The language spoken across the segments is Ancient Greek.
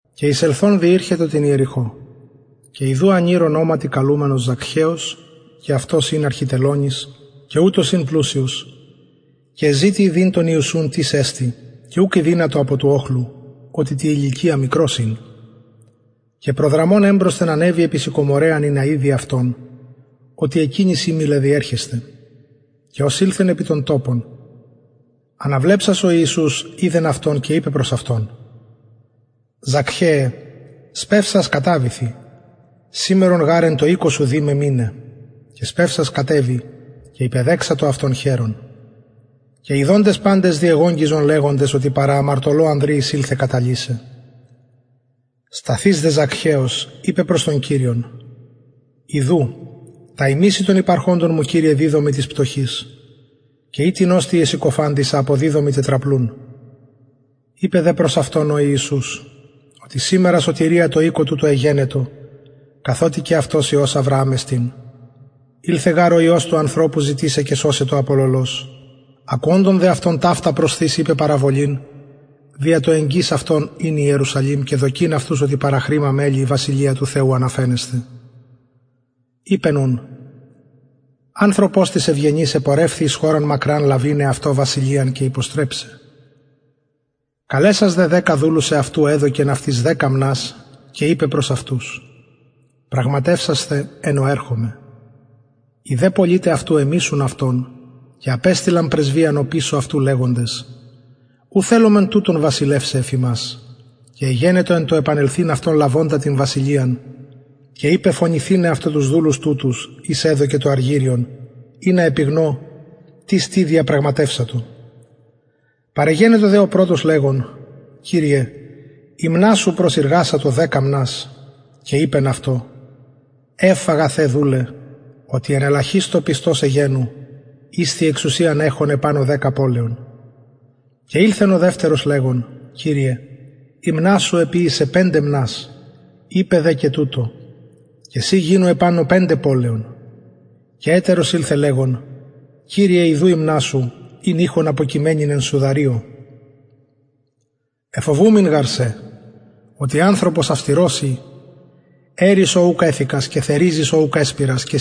και εισελθων διηρχετο την ιεριχω και ιδου ανηρ ονοματι καλουμενος ζακχαιος και αυτος ην αρχιτελωνης και ουτος ην πλουσιος και εζητει ιδειν τον ιησουν τις εστιν και ουκ ηδυνατο απο του οχλου οτι τη ηλικια μικρος ην και προδραμων εμπροσθεν ανεβη επι συκομωραιαν ινα ιδη αυτον οτι εκεινης εμελλεν διερχεσθαι και ως ηλθεν επι τον τοπον αναβλεψας ο ιησους ειδεν αυτον και ειπεν προς αυτον ζακχαιε σπευσας καταβηθι σημερον γαρ εν τω οικω σου δει με μειναι και σπευσας κατεβη και υπεδεξατο αυτον χαιρων και ιδοντες παντες διεγογγυζον λεγοντες οτι παρα αμαρτωλω ανδρι εισηλθεν καταλυσαι σταθεις δε ζακχαιος ειπεν προς τον κυριον ιδου τα ημιση των υπαρχοντων μου κυριε διδωμι τοις πτωχοις και ει τινος τι εσυκοφαντησα αποδιδωμι τετραπλουν ειπεν δε προς αυτον ο ιησους οτι σημερον σωτηρια τω οικω τουτω εγενετο καθοτι και αυτος υιος αβρααμ εστιν ηλθεν γαρ ο υιος του ανθρωπου ζητησαι και σωσαι το απολωλος ακουοντων δε αυτων ταυτα προσθεις ειπεν παραβολην δια το εγγυς αυτον ειναι ιερουσαλημ και δοκειν αυτους οτι παραχρημα μελλει η βασιλεια του θεου αναφαινεσθαι ειπεν ουν ανθρωπος τις ευγενης επορευθη εις χωραν μακραν λαβειν εαυτω βασιλειαν και υποστρεψαι καλεσας δε δεκα δουλους εαυτου εδωκεν αυτοις δεκα μνας και ειπεν προς αυτους πραγματευσασθε εως ερχομαι οι δε πολιται αυτου εμισουν αυτον και απεστειλαν πρεσβειαν οπισω αυτου λεγοντες ου θελομεν τουτον βασιλευσαι εφ ημας και εγενετο εν τω επανελθειν αυτον λαβοντα την βασιλειαν και ειπεν φωνηθηναι αυτω τους δουλους τουτους οις εδωκεν το αργυριον ινα γνω τις τι διεπραγματευσατο παρεγενετο δε ο πρωτος λεγων κυριε η μνα σου προσειργασατο δεκα μνας και ειπεν αυτω ευ αγαθε δουλε οτι εν ελαχιστω πιστος εγενου ισθι εξουσιαν εχων επανω δεκα πολεων και ηλθεν ο δευτερος λεγων κυριε η μνα σου εποιησεν πεντε μνας ειπεν δε και τουτω και συ γινου επανω πεντε πολεων και ετερος ηλθεν λεγων κυριε ιδου η μνα σου ην ειχον αποκειμενην εν σουδαριω εφοβουμην γαρ σε οτι ανθρωπος αυστηρος ει αιρεις ο ουκ εθηκας και θεριζεις ο ουκ εσπειρας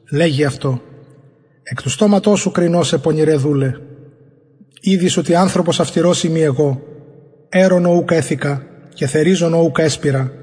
λεγει δε αυτω εκ του στοματος σου κρινω σε πονηρε δουλε ηδεις οτι εγω ανθρωπος αυστηρος ειμι αιρων ο ουκ εθηκα και θεριζων ο ουκ εσπειρα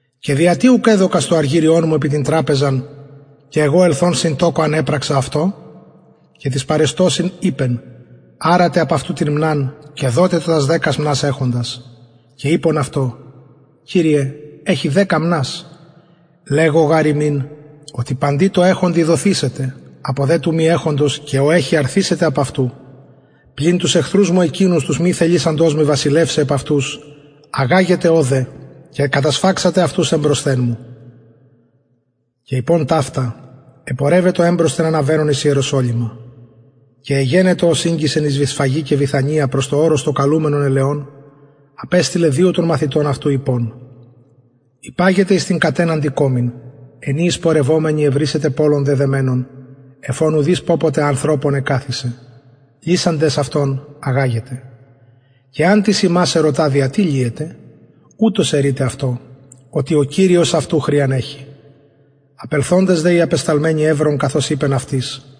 και δια τι ουκ εδωκας το αργυριον μου επι τραπεζαν και εγω ελθων συν τοκω αν επραξα αυτο και τοις παρεστωσιν ειπεν αρατε απ αυτου την μναν και δοτε τω τας δεκα μνας εχοντι και ειπον αυτω κυριε εχει δεκα μνας λεγω γαρ υμιν οτι παντι τω εχοντι δοθησεται απο δε του μη εχοντος και ο εχει αρθησεται απ αυτου πλην τους εχθρους μου εκεινους τους μη θελησαντας με βασιλευσαι επ αυτους αγαγετε ωδε και κατασφαξατε εμπροσθεν μου και ειπων ταυτα επορευετο εμπροσθεν αναβαινων εις ιεροσολυμα και εγενετο ως ηγγισεν εις βηθσφαγη και βηθανιαν προς το ορος το καλουμενον ελαιων απεστειλεν δυο των μαθητων αυτου ειπων υπαγετε εις την κατεναντι κωμην εν η εισπορευομενοι ευρησετε πωλον δεδεμενον εφ ον ουδεις πωποτε ανθρωπων εκαθισεν λυσαντες αυτον αγαγετε και εαν τις υμας ερωτα δια τι λυετε ουτως ερειτε αυτω οτι ο κυριος αυτου χρειαν εχει απελθοντες δε οι απεσταλμενοι ευρον καθως ειπεν αυτοις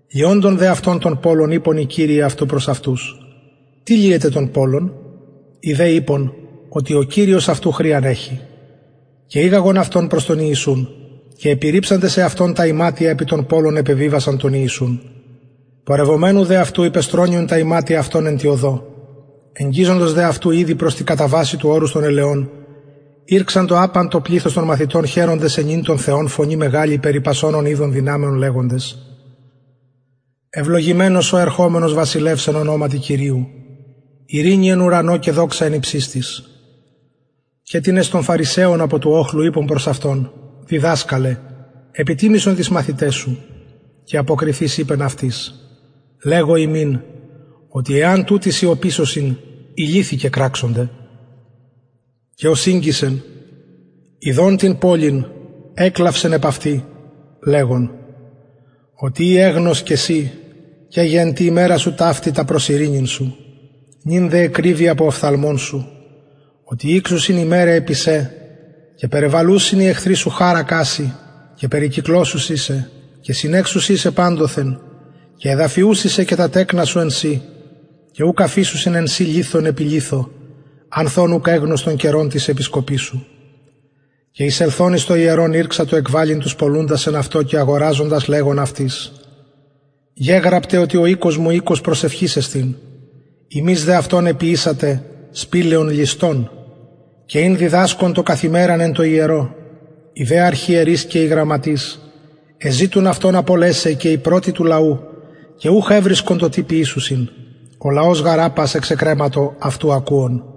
λυοντων δε αυτων τον πωλον ειπον οι κυριοι αυτου προς αυτους τι λυετε τον πωλον οι δε ειπον ο κυριος αυτου χρειαν εχει και ηγαγον αυτον προς τον ιησουν και επιρριψαντες εαυτων τα ιματια επι τον πωλον επεβιβασαν τον ιησουν πορευομενου δε αυτου υπεστρωννυον τα ιματια αυτων εν τη οδω εγγιζοντος δε αυτου ηδη προς τη καταβασει του ορους των ελαιων ηρξαντο απαν το πληθος των μαθητων χαιροντες αινειν τον θεον φωνη μεγαλη περι πασων ων ειδον δυναμεων λεγοντες ευλογημενος ο ερχομενος βασιλευς εν ονοματι κυριου ειρηνη εν ουρανω και δοξα εν υψιστοις και τινες των φαρισαιων απο του οχλου ειπον προς αυτον διδασκαλε επιτιμησον τοις μαθηταις σου και αποκριθεις ειπεν αυτοις λεγω υμιν οτι εαν ουτοι σιωπησωσιν οι λιθοι κεκραξονται και ως ηγγισεν ιδων την πολιν εκλαυσεν επ αυτη λεγων οτι ει εγνως και συ και γε εν τη ημερα σου ταυτη τα προς ειρηνην σου νυν δε εκρυβη απο οφθαλμων σου οτι ηξουσιν ημεραι επι σε και περιβαλουσιν οι εχθροι σου χαρακα σοι και περικυκλωσουσιν σε και συνεξουσιν σε παντοθεν και εδαφιουσιν σε και τα τεκνα σου εν σοι και ουκ αφησουσιν εν σοι λιθον επι λιθω ανθ ων ουκ εγνως τον καιρον της επισκοπης σου και εισελθων εις το ιερον ηρξατο εκβαλλειν τους πωλουντας εν αυτω και αγοραζοντας λεγων αυτοις γεγραπται ο οικος μου οικος προσευχης εστιν υμεις δε αυτον εποιησατε σπηλαιον ληστων και ην διδασκων το καθ ημεραν εν τω ιερω οι δε αρχιερεις και οι γραμματεις εζητουν αυτον απολεσαι και οι πρωτοι του λαου και ουχ ευρισκον το τι ποιησωσιν ο λαος γαρ απας εξεκρεματο αυτου ακουων